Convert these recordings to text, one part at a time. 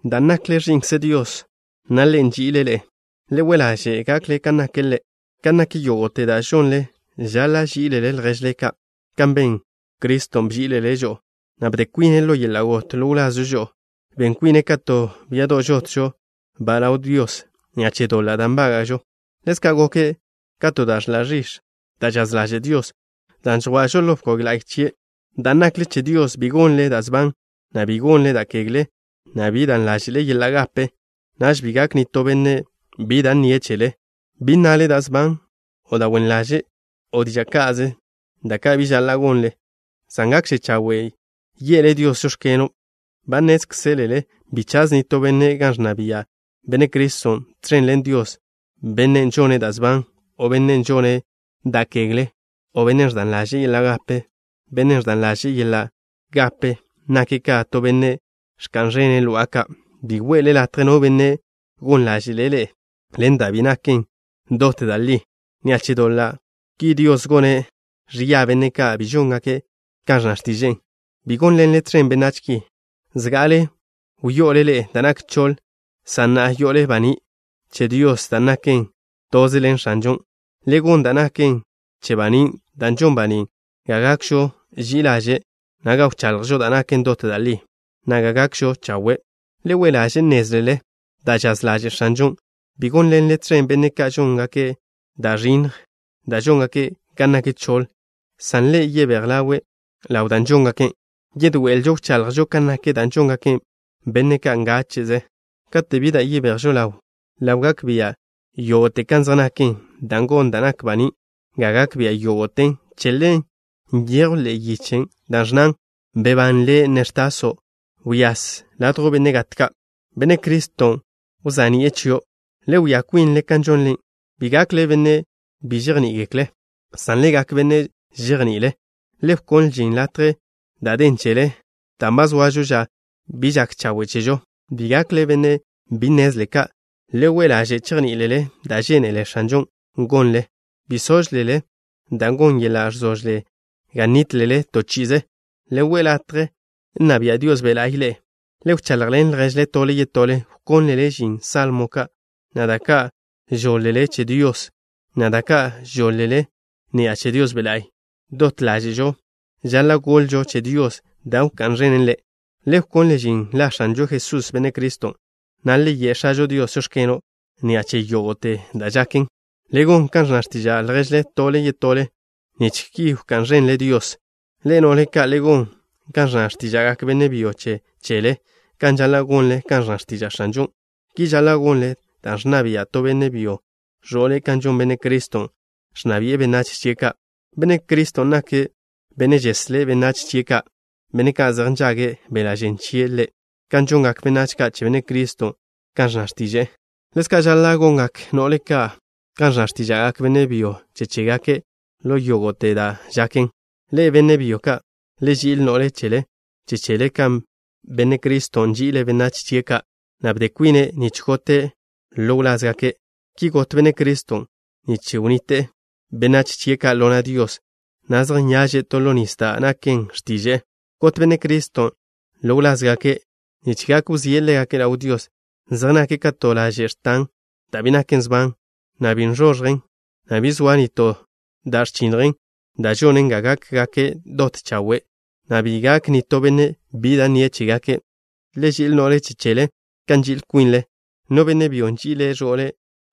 Dan' nakle ẕi'nkze Dios, na' Ḻe' nži'ile' ḻe'e, le we' ḻaže' gakle kan nake' Ḻe'. Kan nak yógo'te da' žonle, žaḻa' ží'ilele lježle ka', kan Benne' Criston' bží'iḻe'ele' žo'o, na' bde kwine' ḻo yeḻa' got ḻo wlazžo žo'o. Ben kwine' ka to biado' žotžo-ba' ḻaw Dios ni'a che doḻa' da' nbága'žo. Ḻezka' goke' ka to da' ẕḻa' ẕix̱, da' žaz ḻaže' Dios, dan' ẕko'žo ḻo bkog la'y chie'. Dan' nakle che Dios, bi gonle da' sban, na' bi gonle da' kegle, na' bi dan ḻáže'le yeḻa' gape. Naž bi gak nitó benne' bi da' nnie' chele. Bi nnale da' sban o da' wen ḻaže' o diža' ka'ze, da' ka' bi žaḻa' gonle, san gakže chawe' ye'le Dios: “Žóx̱keno'.” Ba nnézkzelele bi chaz nitó benne' gan ẕnna bia' Benne' Criston' tẕen ḻen Dios, bennen' žone' da' sban, o bennen' žone' da' kegle, o bennen' ẕdan ḻaže'e yeḻa' gape. Bennen' ẕdan ḻaže'e yeḻa' gape nake' ka to benne' ẕka'n ẕene' lo'a ka'. Bi we'le latje no benne' gon ḻáže'le' ḻe'e ḻen da' bi naken dot da' li. Ni'a che doḻa' ki Dios gone' ẕia benne' ka' bi žóngake' kan ẕnna x̱tiže'e. Bi gónḻenle tẕen benách ki. Zga'ale wyo'ole ḻe'e da' nak choḻ, san na'a yo'ole baní' che Dios, dan' nakle toze ḻen X̱anžon'. Le gon da' naken che banín', dan' žon banín' ga gakžo ži'i ḻaže', na' ga wchaḻjžo da' naken dot da' li, na' ga gakžo chawe'. Le we' ḻaže' nnézlele da' žaz ḻaže' X̱anžon'. Bi gónḻenle tẕen benne' ka' žóngake' da' ẕinnj, dan' žóngake' gan nak choḻ, san le yebéj ḻawe' ḻaw dan' žóngake'. Yedoé'elžo wchaḻjžo kan nak da' žongak benne' ka' ngáche'ze. Kate' bi da' yebejžo ḻawe' ḻaw, gak bia' yógo'te kan zej naken, dan' gon da' nak baní' ga gak bia' yógo'ten. Che ḻen nyejw ḻe'e yiche da' ẕnnan: Bebán, le' na' ẕtaso'. Wyase ladjw benne' gat ka'. Benne' Criston' wza'ni'e chio'. Le wia kwinle kan žonle. Bi gakle benne' bi žejní'igekle', san le gak benne' žejní'igekle'. Le wkonle žin latje da' den chele dan' ba zoažo ža bi žak chawe' chežo. Bi gakle benne' bi nnezle ka'. Le we' ḻaže' chejní'ilele da' žénele X̱anžon' gonlen. Bi sóžlele, dan' gon yeḻa' ẕzožle ga nítlele to chi'ize. Le we' latje nna bia' Dios Be' La'y ḻe'e. Le wchaḻjḻen lježle tole yetole, wkónlele žin salmo ka', na' da' ka' žoḻ-le che Dios, na' da' ka' žoḻ-le ni'a che Dios Be' La'y. Dot ḻáže'žo žaḻa' goḻžo che Dios da' wká'n ẕenen Ḻe'. Le wkonle žin la X̱anžo Jesús, Benne' Criston', na' le ye' X̱ažo Dios: “Žóx̱keno'” ni'a che yógo'te da' žaken. Le gon kan ẕnna x̱tiža' lježle tole yetole nich ki wká'n ẕenle Dios. Ḻe'e, no'le ka', le gon kan ẕnna x̱tíža'gak benne' byo che chele, kan žaḻa' gonle kan ẕnna x̱tiža' X̱anžon'. Ki žaḻa' gonle dan' ẕnna bia' to benne' byo ẕo'le' kan žon Benne' Criston', ẕnna bi'e benách chie' ka'. Benne' Criston' nake' Benne' žeslé' benách chie' ka', benne' ka' zej nžage' beḻa' žen chie' Ḻe'. Kan žongak benách ka' che Benne' Criston' kan ẕnna x̱tiže'e, ḻezka' žaḻa' gongak no'le ka' kan ẕnna x̱tíža'gak benne' byo che chégake' ḻo yógo'te da' žaken. Ḻe'e, benne' byo ka', le ži'il no'le che chele kan Benne' Criston' nži'ile' benách chie' ka', na' bde kwine' nich gote' ḻo wlázgake'. Ki got Benne' Criston' nich wnnite'e benách chie' ka' ḻo na' Dios, na' zej nyaže' to ḻo nis da' naken x̱tiže'e. Got Benne' Criston' ḻo wlázgake' nich gak wzíe' ḻégake' ḻaw Dios, zej nake' ka to laže' x̱tan, da' bi naken sban, na' bi x̱onjen, na' bi zoa nitó da' ẕchinnjen, dan' žone' ga gákgake' dot chawe', na' ga bi gak nitó benne' bi da' nnie' chégake'. Le ži'il no'le che chele kan nži'il kwinle. No benne' byo nži'ile' ẕo'le,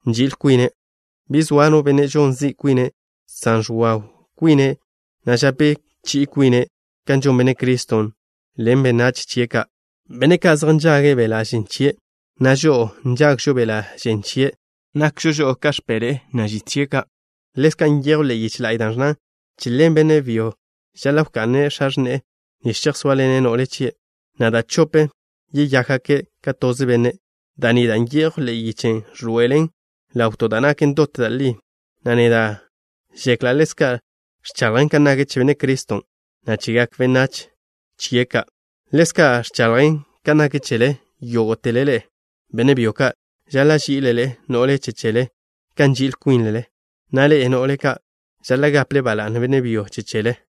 nži'il kwine'. Bi zoa no benne' žon zi' kwine', san ẕwaw kwine', na' žape chi'i kwine', kan žon Benne' Criston' ḻen benách chie' ka', benne' ka' zej nžage' beḻa' žen chie', na' žo'o nžagžo beḻa' žen chien'. Nakžo žo'o ka x̱peḻe'e, na' žit chie' ka'. Ḻezka' nyejw ḻe'e yiche la'y da' ẕnnan: “Che ḻen benne' byo žaḻa' wka'ne' x̱a x̱ne'e nich chejsóaḻene' no'le chie', na' da' chope' yeyákgake' ka toze benne'.” Da' ni da' nyejwn ḻe'e yiche ẕḻoe'elen ḻaw to da' naken dot da' li, na' neda' žekla' ḻezka' ẕchaḻjen kan nak che Benne' Criston', na' chegak benách chie' ka'. Ḻezka' ẕchaḻjen kan nak chele. Yógo'tele ḻe'e, benne' byo ka', žaḻa' ží'ilele no'le che chele kan nži'il kwinle, na' ḻe'e, no'le ka', žaḻa' gaple ba la'ne benne' byon' che chele.